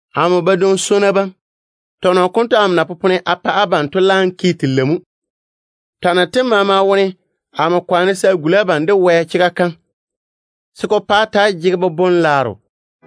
Amo badwoŋ-swonnu bam, tɔnɔ konto amo na popone a pa abam to laam ke telei mo. Twanno tem maama wone amo kwaane se a guli abam de Wɛ chega kam, se ko pa á ta‑á jege boboŋ-laaro.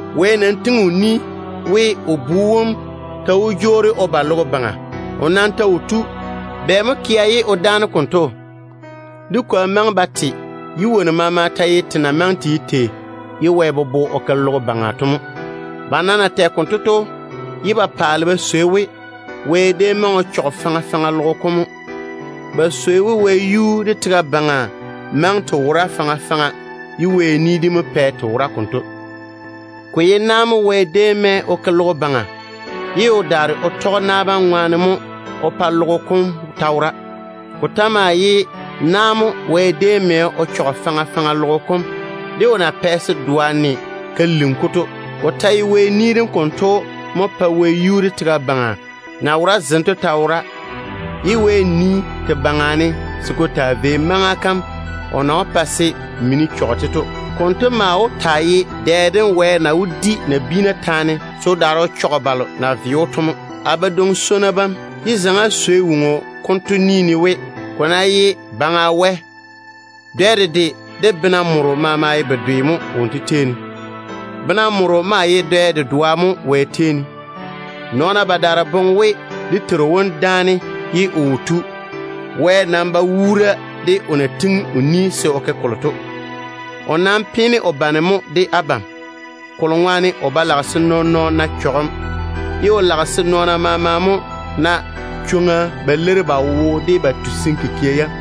“Wɛ pwooli we o Bu wom ta wó jwoori o ba logo baŋa. O nam ta wo tu. Bɛ mo kea ye o dáane konto? Dé kwoa maŋe ba te, ye wonnu maama ta ye te na maŋe te ye tei ye Wɛ bobo o ke logo baŋa to mo.” Ba nam na tɛ konto to ye ba paale ba swei we, Wɛ déem maŋe o chɔge faŋa faŋa logo kom mo. Ba swei we wɛyuu de tega baŋa maŋe te wora faŋa faŋa ye Wɛ ni dem mo pɛ te wora konto. Ko ye na mo Wɛ déem mɛ o ke logo baŋa, ye o daare o tɔge na bam ŋwaane mo o pa logo kom wora. Ko ta maa ye na mo Wɛ déem mɛ o chɔge faŋa faŋa logo kom, de o na pɛ se doa ne ka lini-ko to. Ko ta ye Wɛ ni dem konto mo pae wɛyuu de tega baŋa wora de zem maama, ye Wɛ nii te baŋa ne se ko taa vei maŋa kam o na wó pa se mini chɔge-te to. Konto maa wó taa ye dɛ dem Wɛ na wó di nabiina taane se o daare o chɔge balo na ve‑o to mo. A badwoŋ-swonnu bam, yé zaŋe-na á swei woŋo konto ni ne we, ko ná ye Baŋa Wɛ, dɛ dedwe de bena moro maama ye bedwe mo wonto tei ne. Bena moro maa ye dɛ dedoa mo Wɛ tei ne. Nɔɔna badaara boŋe we dé Teiru wom dáane ye o wo tu. Wɛ nam ba wuura de o na pwooli se o ke kolo to. O nam peene o bane mo de abam, kolo ŋwaane o ba lage se nɔɔn-nɔɔno na chɔgem, ye o lage se nɔɔna maama mo na chwoŋa ba leiri ba wo de ba tusim kikia yam.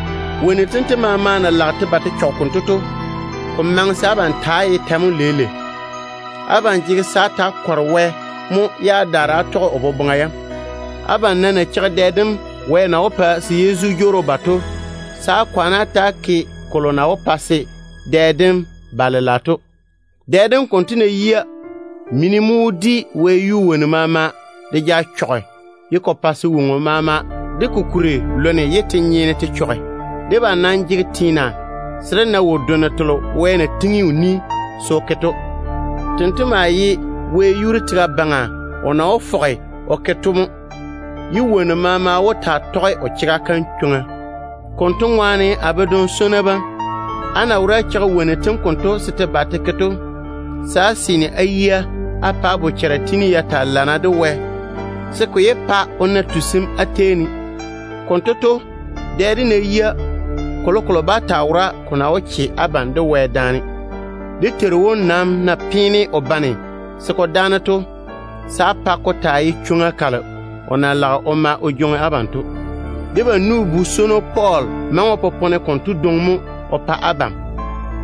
Wonnu tento maama na lage te ba te chɔge konto to, ko maŋe se abam ta‑á ye tɛ mo leile? Abam jege se á ta‑á kɔre Wɛ mo ye á daare á tɔge o boboŋa yam á ŋwea wone. Abam nam na cheigi dɛ dem Wɛ na wó pa se Yezu jwoori o ba to, se á kwaane á ta‑á ke kolo na wó pa se dɛ dem ba lela to. Dɛ dem konto ná yia, mini mo wó di wɛyuu wonnu maama de ja chɔge, pa se woŋo maama de ko kuri lone ye te nyeene te chɔge. Debam nam jege teena se dé na wo-donno telo Wɛ na pwooli se o ke to. Tento maa ye wɛyuu de tega baŋa o na wó fɔge o ke to mo, ye chega kam wó yɔɔre ka taa toŋa jei sem konto ne. Konto ŋwaane a badwoŋ-swonnu bam, á na wora á cheigi wonnu tem konto se te ba te ke to, se á seene á yia á pa á bochara tiini ya taa lana de Wɛ, se ko yé pa o na tusim á tei ne. Konto to, dɛ dem ná yia, kolokolo bá taa wora ko na wó che abam de Wɛ daane. Dé Teiru wom nam na peene o bane se ko dáane to, se á pa ko taa ye chwoŋa kalo o na lage o ma o jwoŋi abam o yage to. Debam nu-bu-swono Pɔɔl maŋe o popone konto dwoŋi mo o pa abam,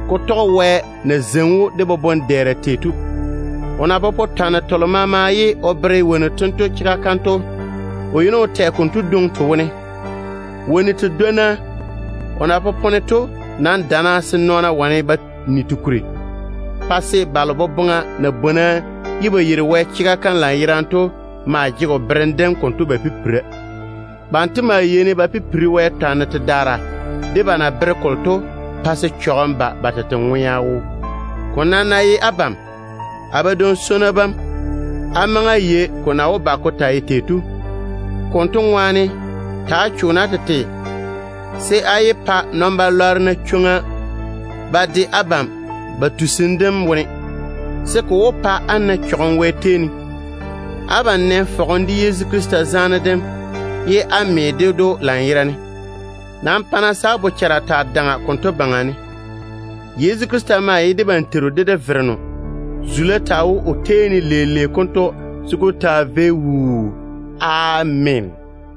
ne Wɛ na zeini‑o de boboŋ-dɛɛra tei to. O na popone twanno telo maama ye o bere wonnu tento chega kam to, o yeini o tɛ konto dwoŋi te wone. Wonnu tedwonna o na popone to nam dana se nɔɔna wane ba ni te kuri, pa se balo boboŋa na bwona ye ba yeiri Wɛ chega kam lanyerane to maa jege o berem dem konto ba pipira. Banto maa yeini ba pipiri Wɛ tɔnɔ jei sedaara de na bere kolo to, pa se chɔgem ba ba tete ŋwea wone. Ko nam ná ye abam, a badwoŋ-swonnu bam, á maŋe á yei ko na wó ba ko taa ye tei to. Konto ŋwaane, ta‑á cho-na á tete se á yé pa puseŋ-nyena na chwoŋa ba de abam ba tusim dem wone, se ko wó pa á daa ba jege zega jei Wɛ chega kam seeni. Abam nɛ fɔgem de Yezu Krista zaane dem ye á lɔre o chega kam lanyerane. Nam pa-na se á boboŋa kweere konto baŋa ne. Yezu Krista maa ye debam Teiru de dé Vereno. Wonto maŋe de teem leile konto se ko taa vei wuu. Ameena.